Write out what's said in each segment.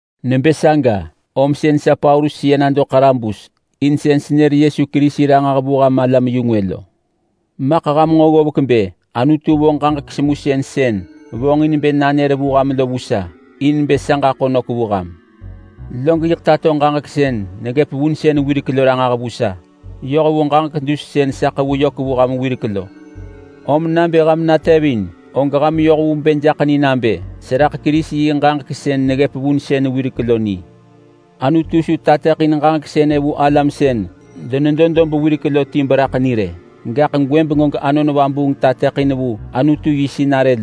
Nebë saga, om sën sa Paulus seya nado ḳarabus in sën senër Yesu Kerisi ranġah vu ham alam-yu-ngwë lo. Maḳ ham nġo ggovek bë Anutu vo ġaġek semusën sën vonġin bë nanër vu ham lo vu sa in bë sa ġaḳo nök vu ham. Log yiḳ tato ġaġek sën neggëp vunsën wirek lo ranġah vu sa, yoh vu ġaġek dus sën sa ḳevu yök vu ham wirek lo. Om nabë ham natevin, og ham yoh vu bë jaḳ ni nabë seraḳ Kerisi yi ġaġek sën neggëp vunsën wirek lo ni. Anutu su tateḳin ġaġek sënë vu alam sën denedo dob wirek lo ti beraḳ ni rë. Gaḳ gwëbeng og Anon Vabuung tateḳin vu Anutu yi sinarë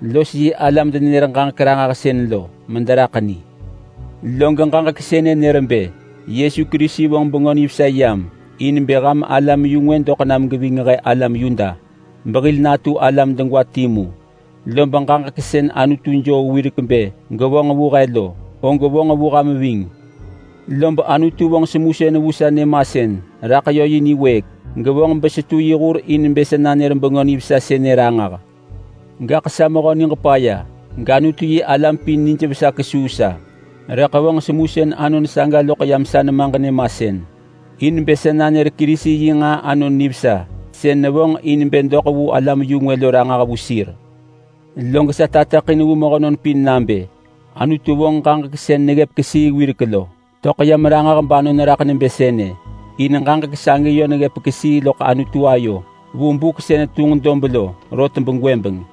los yi alam-denenër-ġaġek-ranġahsën mederaḳ ni. Log ġaġek sënë nër bë Yesu Kerisi vonġ Bengö Nivesa yam in bë ham alam-yu-ngwë doḳ nam geving he alam Yuda behil natu alam degwa timu. Lob ġaġek sën Anutu joo wirek bë gevonġ vu he lo, og vonġ vu ham ving. Lob Anutu vonġ semusën vu sa nyëmasën raḳ yö yi niwëëk, gevonġ besetu yi hur in bë sa nanër Bengö Nivesa sënë ranġah. Gaḳ sa mehö niġ paya gAnutu-yi-alam pin nijvesa kesuu sa. Rëḳ vonġ semusën anon saga loḳ yam sa nemaġ nyëmasën, in bë sa nanër Kerisi yi nġaa anon nivesa sën nevonġ in bë doḳ vu alam-yu-ngwë lo ranġah vu sir. Log sa tateḳin vu mehönon pin nabë Anutu vonġ ġaġek sën neggëp kesii wirek lo töḳ yam ranġah banon raḳ nebë sënë. In ġaġek sagi yö neggëp kesii loḳ Anutu ayo vu buk sën tunġ dob lo rot begwëbeng.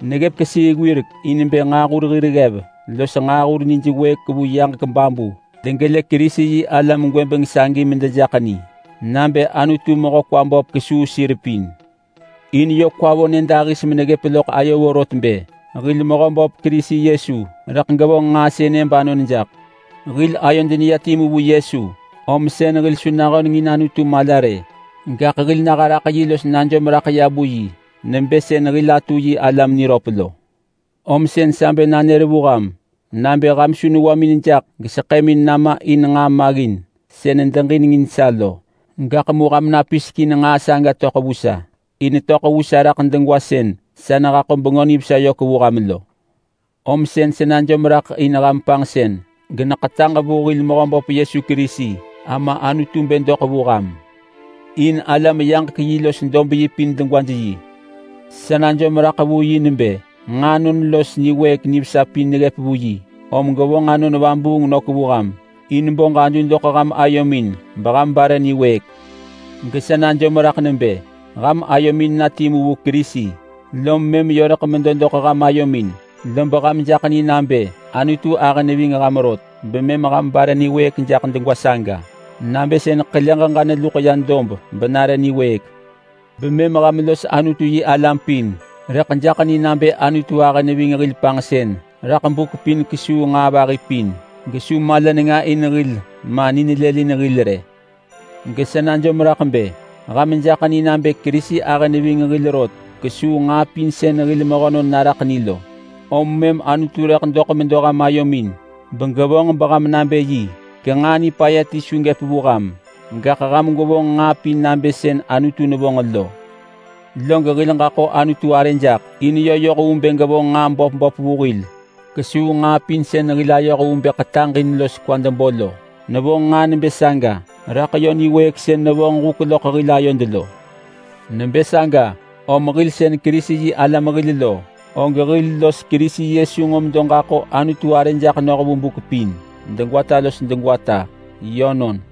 Neggëp kesii wirek in bë nġaahur hir ggev los nġaahur nij wëëk vu yaġek babu degelë Kerisi-yi-alam gwëbeng sagi medejaḳ ni nabë Anutu mehö kwa böp kesuu sir pin. In yö kwa vo nyëdahis meneggëp loḳ ayo vorot bë hil Mehöböp Kerisi Yesu rëḳ gevonġ nġaa sënë banon jaḳ. Hil ayod neya timu vu Yesu om sën hil su nahöneng in Anutu mala rë, gaḳ hil naha raḳ yi los najom raḳ ya vu yi nebë sën hil atu yi alam niröp lo. Om sën sa bë nanër vu ham nabë ham su newamin jaḳ geseḳëmin nama in nġaa maggin sën nedeġinengin sa lo rë. Gaḳ mu ham napisek in nġaa saga töḳ vu sa, in netöḳ vu sa raḳ degwa sën sa nehaḳo Bengö Nivesa yök vu ham lo. Om sën sa najom raḳ in ham panġsën geneketaġ vu hil Mehöböp Yesu Kerisi Ama Anutu bë doḳ vu ham. In alam yaġek-yi los dob-yi pin degwaj yi. Sa najom raḳ vu yi nebë: Nġaanon los niwëëk nivesa pin neggëp vu yi, om gevonġ Anon Vabuung nök vu ham in bo ġadu doḳ ham ayomin beham bare niwëëk. Gesa najom raḳ nebë: Ham ayomin na timu vu Kerisi, lom mëm yö rëḳ medo doḳ ham ayomin. Lob ham jaḳ ni nabë Anutu ahë neving ham rot, bemëm ham bare niwëëk jaḳ degwa saga, nabë sën ḳele ġeġa neluḳ ya dob benare niwëëk. Bemëm ham los Anutu-yi-alam pin rëḳ jaḳ ni nabë Anutu ahë neving hil panġsën raḳ buk pin kesuu nġaa vahi pin, gesu mala nenga in hil ma ni nelëlin hil rë. Gesa najom raḳ bë ham jaḳ ni nabë Kerisi ahë neving hil rot kesuu nġaa pin sën hil mehönon naraḳ ni lo. Om mëm Anutu rëḳ doḳ medo ham ayomin begevonġ beham nabë yi, genġaa nipaya ti su gëp vu ham. Gaḳ ham gwevonġ nġaa pin nabë sën Anutu nevonġ lo. Log hil ġaḳo Anutu arë jaḳ, in yö yoh vu bë gevonġ nġaa böp böp vu hil kesuu nġaa pin sën hil ayoh vu bë ḳetaġ in los kwad bo lo. Nevonġ nġaa nebë saga raḳ yö niwëëk sën nevonġ huk loḳ hil ayod lo. Nebë saga om hil sën Kerisi-yi-alam hil lo, og hil los Kerisi Yesu nġo medo ġaḳo Anutu arë jaḳ noh vu buk pin degwata los degwata. Yönon.